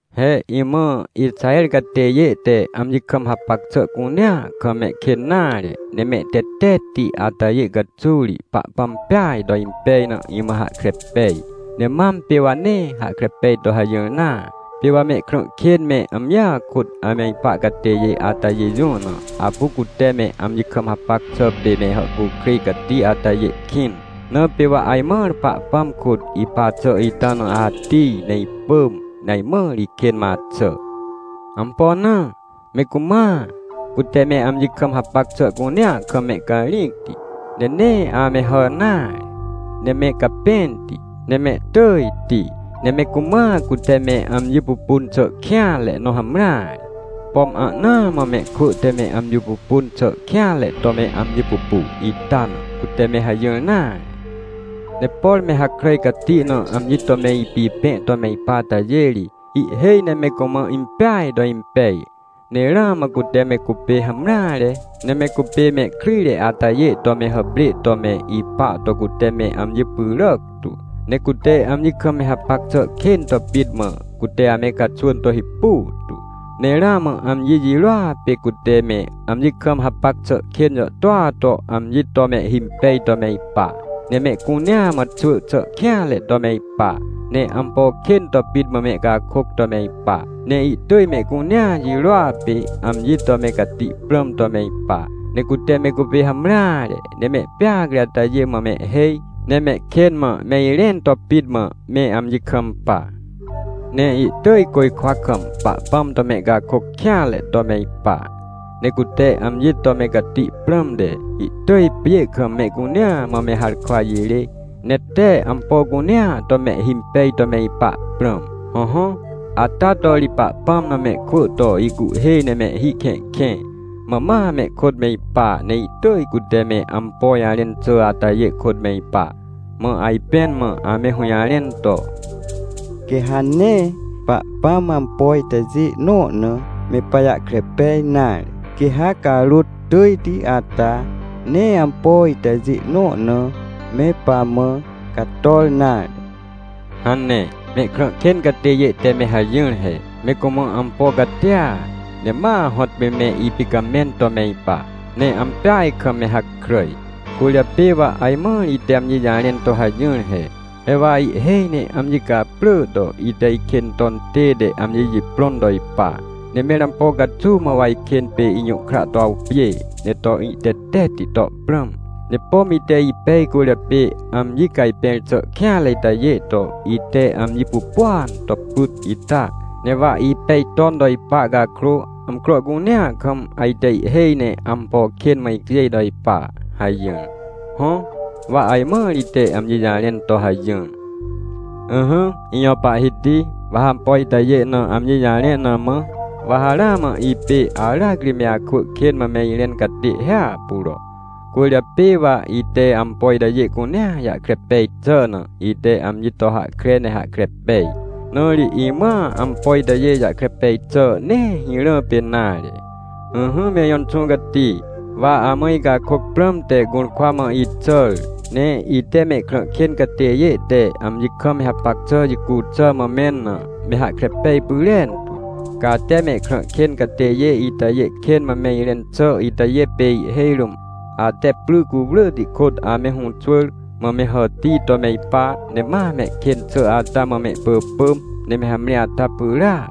He imã, Ixaher catêjê te amji kam hapac xà cunea kam mehkên nare, ne mehtetetti atajê caxuw ri, Pahpãm peaj to impej na, imã hahkre pej. Ne mam pê wa nee hahkre pej to hajỹr nare. Pê wa mehkrã kên me, amjia kôt ame ipa catêjê atajê jũ na, apu cute me amji kam hapac xà pê me hàhcukrêj cati atajê kĩn. Na pê wa ajmãr Pahpãm kôt ipa xà ita na atij, ne ipỳm, ne ajmãr ikên mã axà. Ampo na? Me cumãa, cute me amji kam hapac xà cunea kam mehcarĩcti. Ne nee ame hà nare, ne me capẽnti, ne mehtỳjti. Ne me cumãa, cute me amji pupun xà kêanre nõ hamreare. Pom ahnaa mã mehkwỳ te me amji pupun xà kêanre to me amji pupu ita na, cute me hajỹr nare. Ne por me hakràj cati na amji to me ipipẽ to me ipa atajê ri, ihhêj ne me cumã impeaj to impej. Ne ramã cute me cupê hamreare, ne me cupê mehkryjre atajê to me hàprê to me ipa to cute me amji pyràc tu. Ne cute amji kam me hapac xà kên to pit mã, cute ame caxwỳn to hipu tu. Ne ramã amji jirôa pê cute me amji kam hapac xà kên jàhtôa to amji to mehhimpej to me ipa. Ne mehcunea mã xwỳ xà kêanre to me ipa, ne ampo kên to pit mã mehcakôc to me ipa. Ne ihtỳj mehcunea jirôa pê amji to me cati prãm to me ipa. Ne cute me cupê hamreare, ne mehpeacre atajê mã mehhêj, ne mehkên mã me irẽn to pit mã me amji kampa. Ne ihtỳj côjkwa kam Pahpãm to mehcakôc kêanre to me ipa. Ne cute amji to me cati prãmte, ihtỳj pjê kam mehcunea mã me harkwa jirê, ne tee ampo cunea to mehhimpej to me ipa prãm. Hõhõ, ata to ri Pahpãm na mehkwỳ to ihcuhhê ne mehhi kẽhkẽ, mã ma mehkôt me ipa, ne ihtỳj cute me ampo jarẽn xà atajê kôt me ipa. Mã ajpẽn mã ame hũjarẽn to: “Quê ha nee Pahpãm ampo itajê nõ na me pajahkre pej nare. Quê ha Carôt Tỳjti ata nee ampo itajê nõ na me pamã cator nare” hane. Mehkrã kên catêjê te me hajỹr he. Me cumã ampo catia, ne ma hõtpê me ipicamẽn to me ipa, ne ampeaj kam me hakràj. Cwỳrjapê wa ajmãr ite amji jarẽn to hajỹr he: “He wa ihhêj ne amji caprỳ to, ite ikên ton tête amji jiprõn to ipa. Ne mẽr ampo caxuw mã wa ikên pê ijũhkra to awpjê, ne to ihtetetti to prãm? Ne pom ite ipej cwỳrjapê amji cajpẽr xà kêanre itajê to, ite amji pupuan to pyt ita? Ne wa ipej ton to ipa cakrô, amcro cunea kam ajte ihhêj ne ampo kên mã icjêj to ipa” hajỹr. Hõ, wa ajmãr ite amji jarẽn to hajỹr. Ỹhỹ ijõ Pahhiti, wa ha ampo itajê na amji jarẽ na mã, wa ha ramã ipê aracri me akwỳ kên mã me irẽn catê hiahpuro. Cwỳrjapê wa ite ampo itajê cunea jahkre pej xà na, ite amji to hahkre ne hahkre pej. Na ri imãa ampo itajê jahkre pej xà nee hirã pê nare. Ỹhỹ me ijõ Inxũ Cati, wa amã icakôc prãmte gũrkwa mã ixàr, ne ite mehkrã kên catêjê te amji kam me hapac xà jicu xà mã mẽn na, me hahkre pej pyrentu. Ca ate mehkrã kên catêjê itajê kên mã me irẽn xà itajê pê ihhêj rũm ate pry cuwrỳhti kôt ame hũxwỳr, mã me hàtij to me ipa, ne ma mehkên xà ata mã mehpỳpỳm, ne me hamre ata pyràac.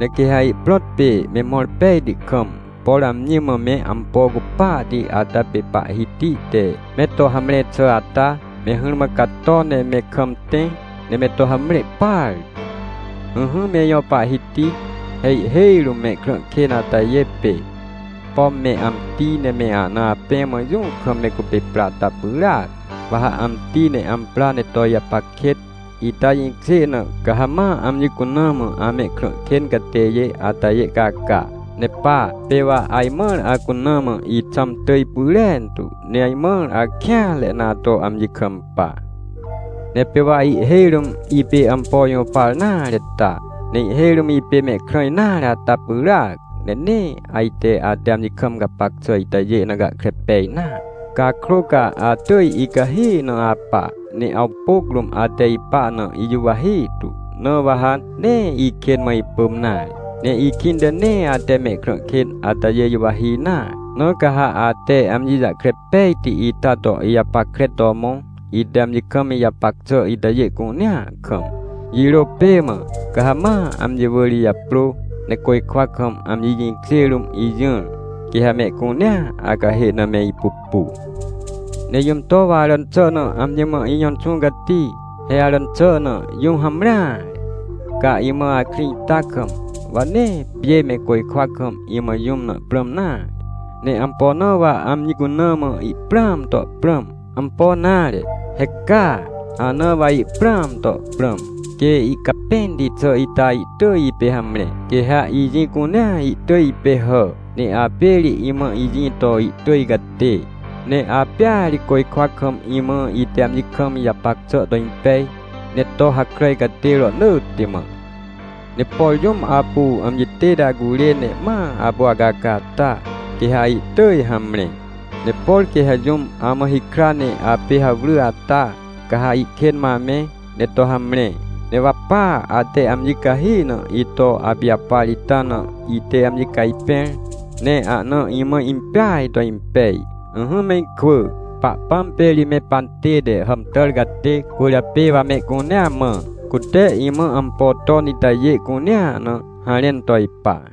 Ne quê ha ihprõt pê, me mõr pejti kam, por amji mã me ampo cupahti ata pê Pahhiti te me to hamre xà ata, me hỹrmã cato ne me kam tẽ, ne me to hamre partu. Ỹhỹ me ijõ Pahhiti, he ihhêj rũm mehkrã kên atajê pê, pom me amti, ne me ahna apẽ, mã jũ kam me cupê pra ata pyràac. Wa ha amti ne ampra ne to ijapac kêt, ita jĩkjê na, ca ha ma amji cuna mã amehkrã kên catêjê atajê caca. Ne pa, pê wa ajmãr acuna mã ixãm tỳj pyrentu, ne ajmãr akêanre na ato amji kampa. Ne pê wa ihhêj rũm ipê ampo jũpar nare ta, ne ihhêj rũm ipê mehkrã nare ata pyràac, ne nee ajte ate amji kam gapac xà itajê na gahkre pej nare. Cakrô ca atỳj icahi na apa, ne awpôc rũm ate ipa na ijuwahi tu, na wa ha nee ikên mã ipỳm nare. Ne ikĩnte nee ate mehkrã kên atajê juwahi nare. Na ca ha ate amji jahkre pejti ita to ijapackre to mõ, ite amji kam ijapac xà itajê cunea kam. Jirô pê mã, ca ha ma amji wỳr ijaprô, ne côjkwa kam, amji jĩkjê rũm ijỹr. Quê ha mehcunea acahê na me ipupu. Ne jũm to wa aràn xà na amji mã ijõ Inxũ Cati? He aràn xà na jũm hamreare! Ca imã akrĩ ita kam, wa nee pjê me côjkwa kam imã jũm na prãm nare. Ne ampo na wa amji cuna mã ihprãam to prãm? Ampo nare, he ca! Ana wa ihprãam to prãm! Quê icapẽnti xà ita ihtỳj ipê hamre, quê ha ijĩ cunea ihtỳj ipê hà, ne apê ri imã ijĩ to ihtỳj catê. Ne apêa ri côjkwa kam imã, ite amji kam ijapac xà to impej, ne to hakràj catê rohnỳtti mã. Ne por jũm apu amji tête acurê ne ma apu acaca ata, quê ha ihtỳj hamre. Ne por quê ha jũm amã hikra ne apê hawry ata, ca ha ihkên mã amẽ, ne to hamre. Ne wa pa ate amji cahi na ito apijapar ita na ite amji cajpẽr, ne ahna imã impeaj to impej. Ỹhỹ me ikwỳ, Pahpãm pê ri me pantête hàmtàr catê, cwỳrjapê wa mehcunea mã, cute imã ampo ton itajê cunea na, harẽn to ipa.